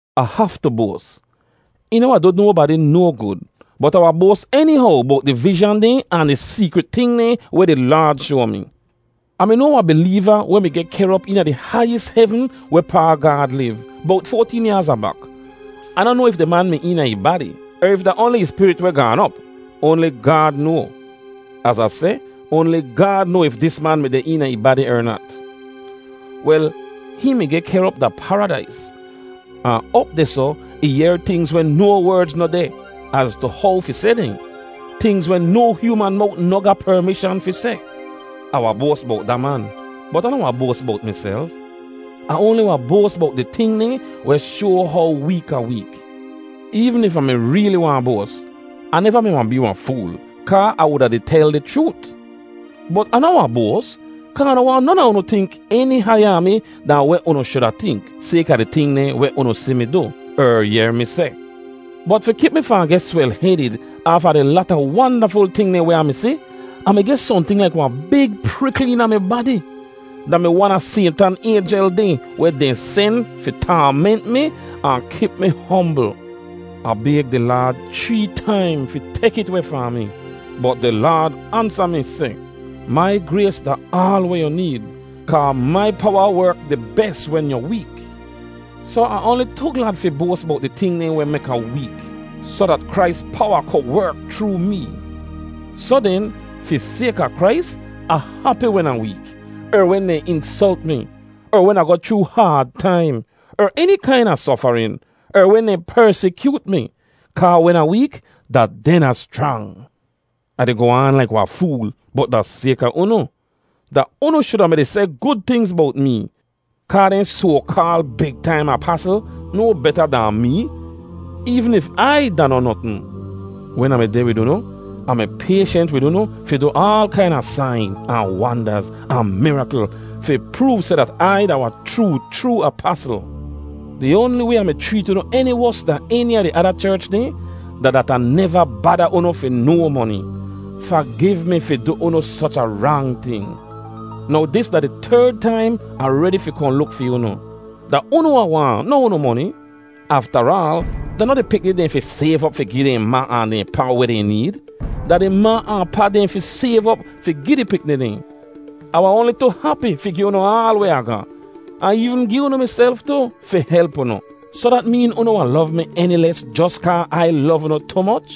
Ah haftu boas. Ih noh wahn du nobadi no gud, bot Ah wahn boas enihow bowt di vizhan dehn ahn di seekrit ting dehn weh di Laad shoa mi. Ah mi noa wahn bileeva weh mi geh kehr op eena di haiyis hevn wehpaa Gaad liv, bowt foateen yaaz abak. Ah noh noa if di man mi eena ih badi, er if da oanli ih spirit weh gaan op—oanli Gaad noa. Az Ah seh, oanli Gaad noa if dis man mi deh eena ih badi er nat. Wel, hihn mi geh kehr op da Paradais, ahn op dehsoh ih yehr tingz weh no werdz noh deh az tu how fi seh dehn; tingz weh no hyooman mowt noh ga permishan fi seh. Ah wahn boas bowt da man, bot Ah noh wahn boas bowt miself. Ah oanli wahn boas bowt di ting dehn weh shoa how week Ah week. Eevn if Ah mi reeli waahn boas, Ah neva mi wahn bee wahn fool kaa Ah wuda di tel di chroot. Bot Ah noh wahn boas, kaa Ah noh waahn non a unu tink eni haiya a mi dahn weh unu shuda tink, sayka di ting dehn weh unu si mi du, er yehr mi seh. Bot fi kip mi fahn geh swel-hedid aafa di lata wandaful ting dehn weh Ah mi si, Ah mi geh sohnting laik wahn big prikl eena mi badi. Da mi wan a Saytan aynjel dehn weh dehn sen fi taament mi ahn kip mi hombl. Ah bayg di Laad chree taim fi tek it weh fahn mi. Bot di Laad ansa mi seh, “Mai grays da aal weh yu need, kaa mai powa werk di bes wen yu week.” Soh Ah oanli tu glad fi boas bowt di ting dehn weh mek Ah week, soh dat Krais powa ku werk chroo mee. Soh den, fi sayka Krais, Ah hapi wen Ah week, er wen dehn insolt mi, er wen Ah goh chroo haad taim er eni kaina sofarin, er wen dehn persikyoot mi, kaa wen Ah week, da den Ah schrang. Ah di goh aan laik wahn fool, bot da sayka unu. Da unu shuda mi-di seh gud tingz bowt mee, kaa dehn soa-kaal “big taim apasl” no beta dahn mee, eevn if Ai da noh notn. Wen Ah mi deh wid unu Ah mi payshent wid unu fi du aal kaina sain, ahn wandaz ahn mirakl fi proov seh dat Ai da wahn chroo chroo apasl. Di oanli way Ah mi chreet unu eni wos dahn eni a di ada cherch dehn, da dat Ah neva bada unu fi no moni. Fagiv mi fi du unu soch a rang ting! Now dis da di terd taim Ah redi fi kohn luk fi unu. Da unu Ah waahn, noh unu moni. Aftaraal, da noh di pikni dehn fi sayv op fi gi dehn ma ahn dehn pa weh dehn need. Da di ma ahn pa dehn fi sayv op fi gi di pikni dehn. Ah wahn oanli tu hapi fi gi unu aal weh Ah ga, ahn eevn gi unu miself tu, fi help unu. Soh dat meen unu wahn lov mi eni les jos kaa Ai lov unu tu moch?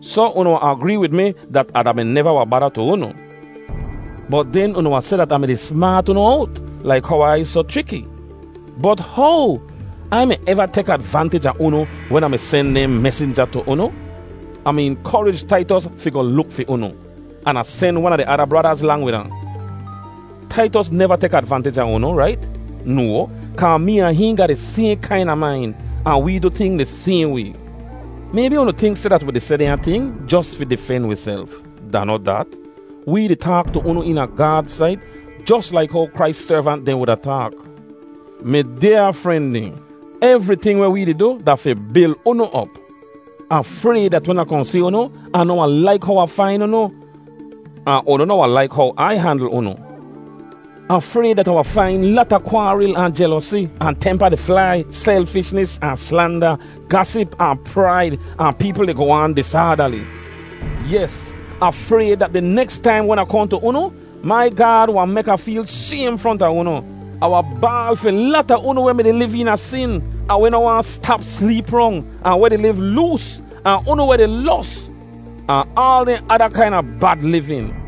Soh, unu wahn agree wid mi dat Ah da-mi neva wahn bada tu unu. Bot den unu wahn seh dat Ah mi-di smaat unu owt laik how Ai soh chriki. Bot how? Ai mi eva tek advantij a unu wen Ah mi sen dehn mesinja tu unu? Ah mi inkorij Taitos fi goh luk fi unu, an Ah sen wan a di ada bradaz lang wid ahn. Taitos neva tek advantij a unu, rait? No, kaa mee ahn hihn ga di sayhn kaina main, ahn wee du ting di sayhn way. Maybi unu tink seh dat wi di seh dehnya ting jos fi difen wiself. Da noh dat. Wee di taak tu unu eena Gaad sait jos laik how Krais servant dehn wuda taak. Mi dyaa fren dehn, evriting weh wee di du da fi bil unu op. Ah frayd dat wen Ah kohn si unu Ah noh wahn laik how Ah fain unu, ahn unu noh wahn laik how Ai handl unu. Ah frayd dat Ah wahn fain lata kwaaril, ahn jelosi, ahn tempa di flai, selfishnis, ahn slanda, gasip, ahn praid, ahn peepl di goh aan disaadali. Yes, Ah frayd dat di neks taim wen Ah kohn tu unu, mai Gaad wahn mek Ah feel shaym fronta unu. Ahn wahn baal fi lata unu weh mi-di liv eena sin, ahn weh noh waahn stap sleep rong, ahn weh di liv loos, ahn unu weh di los, ahn aal dehn ada kaina bad livin.